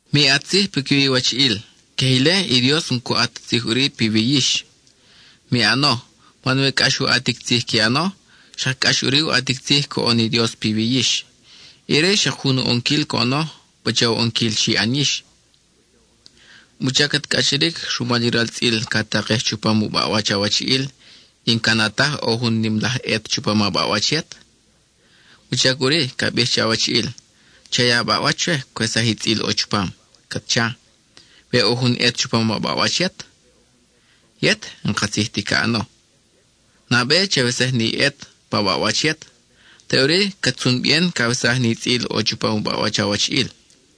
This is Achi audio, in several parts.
Mi ʼat tzij piquiwi iwachiʼil, queje ile, i Dios n-cu ʼat ti tzij ʼuri piwi yix. Mi ʼano, man we cʼax u ʼatic tzij qui ʼano, xak cʼax ʼuri u ʼatic tzij coʼon i Dios piwi yix; ire xak jun u ʼonquil coʼono, pacha u ʼonquil xi ʼan yix. ¿Wuchac cat cʼachiric rumal i ral tzʼil ca takej chupam u baʼwach awachiʼil, y n-ca na taj ʼo jun nim laj ʼet chupam a baʼwach yet? ¿Wuchac ʼuri ca bij che awachiʼil: “Cha ya a baʼwach chwe, cwesaj i tzʼil ʼo chupam,” cat cha, we ʼo jun ʼet chupam a baʼwach yet? Yet, ¡n-katzij ti ca ʼano! Nabe chawesaj ni ʼet pa baʼwach yet, teʼuri cat tzun bien cawesaj ni tzʼil ʼo chupam u baʼwach awachiʼil.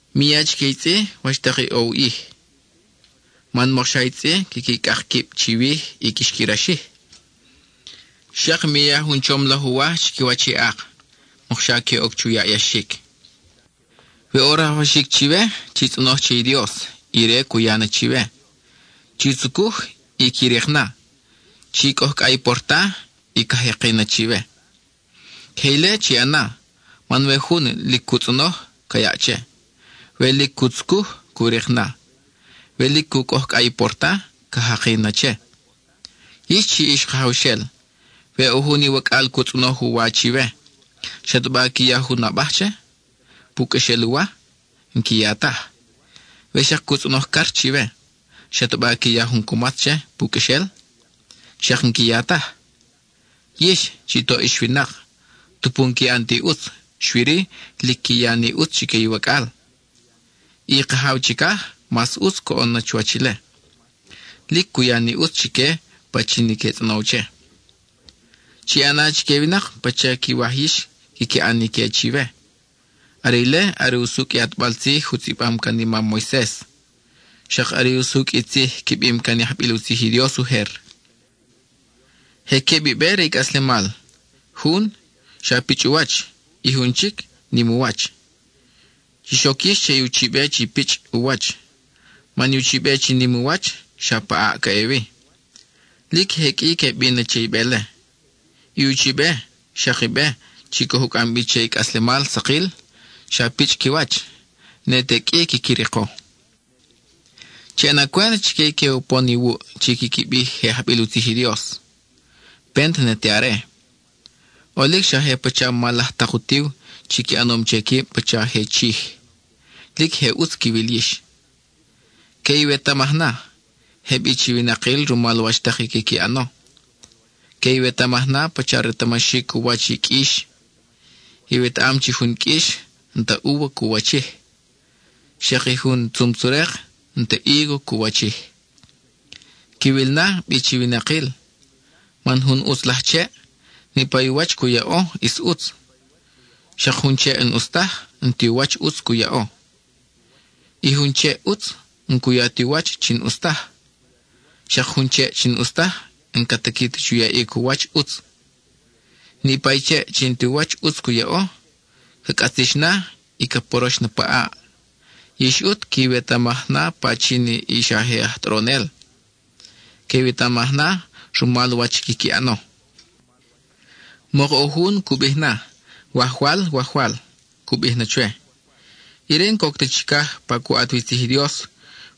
Mi ya chique i tzʼi wach tak i ʼo u ʼij, man mokxa i tzʼi quiqui cʼak quib chiwij y quix qui raxij. Xak mi ya jun chom laj uwaj chiquiwach i ak, mokxa que oc chu yaʼyaxic. We ʼo rajwaxic chiwe, chi tzʼonoj che i Dios y Ire cu ya na chiwe; chi tzucuj, y qui rik na; chi cʼojcʼa i porta, y ca jaki na chiwe. Queje ile chi ʼana, man we jun lic cu tzʼonoj, ca yaʼ che; we lic cu tzucuj, cu rik na; we lic cu cʼojcʼa i porta, ca jaki na che. Yix chi ix kajawxel, we ʼo jun iwacʼal cu tzʼonoj u wa chiwe, ¿xataba qui ya jun abaj che, pu qʼuexel u wa? N-qui ya taj. We xak cu tzʼonoj car chiwe, ¿xataba qui ya jun cumatz che, pu qʼuexel? Xak n-qui ya taj. Yix, chi toʼ ix winak, tupu n-qui ʼan ti ʼutz, xui-ri, lic qui ya ni ʼutz chique iwacʼal. I Kajaw chicaj, mas ʼutz coʼon na chuwach ile; lic cu ya ni ʼutz chique pachin i que tzʼonow che. Chi ʼana chique i winak pacha i quiwaj yix quiqui ʼan na ique chiwe. Are ile are usucʼ i ʼatbal tzij u tzʼibam can i mam Moises, xak are i usucʼ i tzij qui bim can i ajbil u tzij i Dios ujer. Je queb i be re i cʼaslemal: jun, xa pichʼ u wach y jun chic, nim u wach. Chix oc yix che i uchibe chi pichʼ u wach, man i uchibe chi nim u wach, xa pa ʼaʼ ca ʼe wi. Lic je qʼui que bin na che i be-le. I uchibe, xak i be, chi coj u cʼam bi che i cʼaslemal sakil, xa pichʼ qui wach; ne te qʼui quiqui riko. Chi ʼana cwent chique i que upon iwuʼ chi quiqui bij je ajbil u tzij i Dios; pent ne te are. ʼOlic xa je pacha mal laj tak utiw chi qui ʼanom che quib pacha je chij; lic je ʼutz quiwil yix. Que iwetamaj na, je bi chi winakil rumal wach tak i quiqui ʼano. Que iwetamaj na pacha retamaxic u wach i qʼuix. Iwetaʼam chi jun qʼuix n-ta úva cu wachij; xak i jun tzum-tzerek n-ti hígo cu wachij. Quiwil na bi chi winakil, man jun ʼutz laj cheʼ, niʼpa i u wach cu yaʼo ʼis ʼutz; xak jun cheʼ n-ʼus taj, n-ti u wach ʼutz cu yaʼo. I jun cheʼ ʼutz, n-cu ya ti u wach chi n-ʼus taj; xak jun cheʼ n-ʼus taj n-ca tiqui ta chu yaʼic u wach ʼutz. Niʼpa i cheʼ chi n-ti u wach ʼutz cu yaʼo, ca cʼatzix na, y ca porox na pa ʼaʼ. Yix ʼut que iwetamaj na pachin i xa je aj tʼoronel; que iwetamaj na rumal wach quiqui ʼano. Mok ʼo jun cu bij na, “Wajwal, Wajwal,” cu bij chwe, ire n-coc ta chicaj pa cu ʼat wi tzij i Dios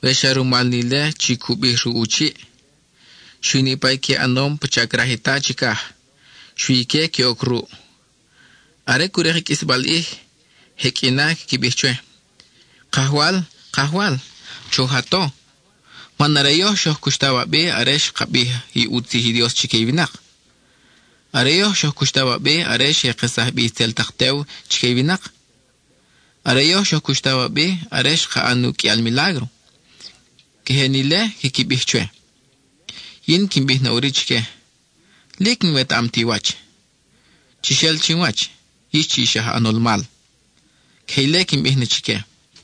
we xa rumal ni ile chi cu bij ruʼ u chiʼ. Xui niʼpa i qui ʼanom pacha craj i Ta chicaj, xui ique que oc ruʼ. Are cu rik i qʼuisbal ʼij, je qʼui na quiqui bij chwe: “Kajwal, Kajwal, choj a to, man are yoj xoj cuxtaw a bi are xka bij u tzij i Dios chique i winak; are yoj xoj cuxtaw a bi are xe kesaj bi itzel tak tew chique i winak; are yoj xoj cuxtaw a bi are xka ʼan uqʼuial milágro.” (Queje ni ile quiqui bij chwe.) Yin quin bij na ʼuri chique: “Lic n-wetaʼam ti wach; ¡chix el chin wach, yix chi ix aj ʼanol mal!” (Queje ile quin bij na chique.)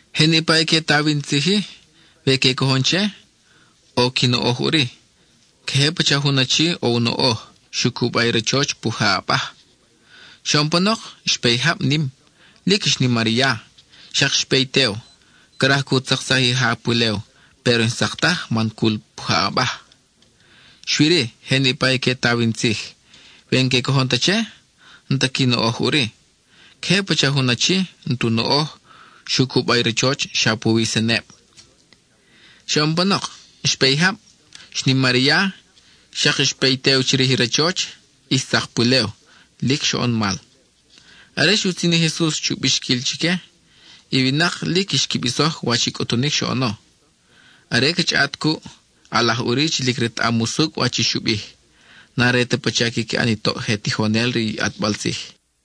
Je niʼpa i que taw in tzij-i, we que cojon che, ʼo qui noʼoj ʼuri. Queje pacha jun achi, ʼo u noʼoj, xu cuba i rachoch pujaʼ abaj. Xoʼon panok, xpe i jab nim, lic xnimar i ya, xak xpe i tew, craj cu tzaksaj i ja pulew péro n-xtzak taj man cul pujaʼ abaj. Xui-ri, je niʼpa i que taw in tzij, we n-que cojon ta che, n-ta qui noʼoj ʼuri. Queje pacha jun achi, n-tu noʼoj, xu cuba i rachoch xa puwi i seneb. Xoʼon panok, xpe i jab; xnimar i ya; xak xpe i tew chirij i rachoch, y xtzak pulew. ¡Lic xoʼon mal! Are xutzin i Jesus chu bixquil chique, i winak lic xqui bisoj wach i cʼutunic xoʼono. Are ca chʼaʼat cuʼ, ʼalaj ʼuri chi lic retaʼam usucʼ wach i xu bij; n-are ta pacha quiqui ʼan i toʼ je tijonel re i ʼatbal tzij.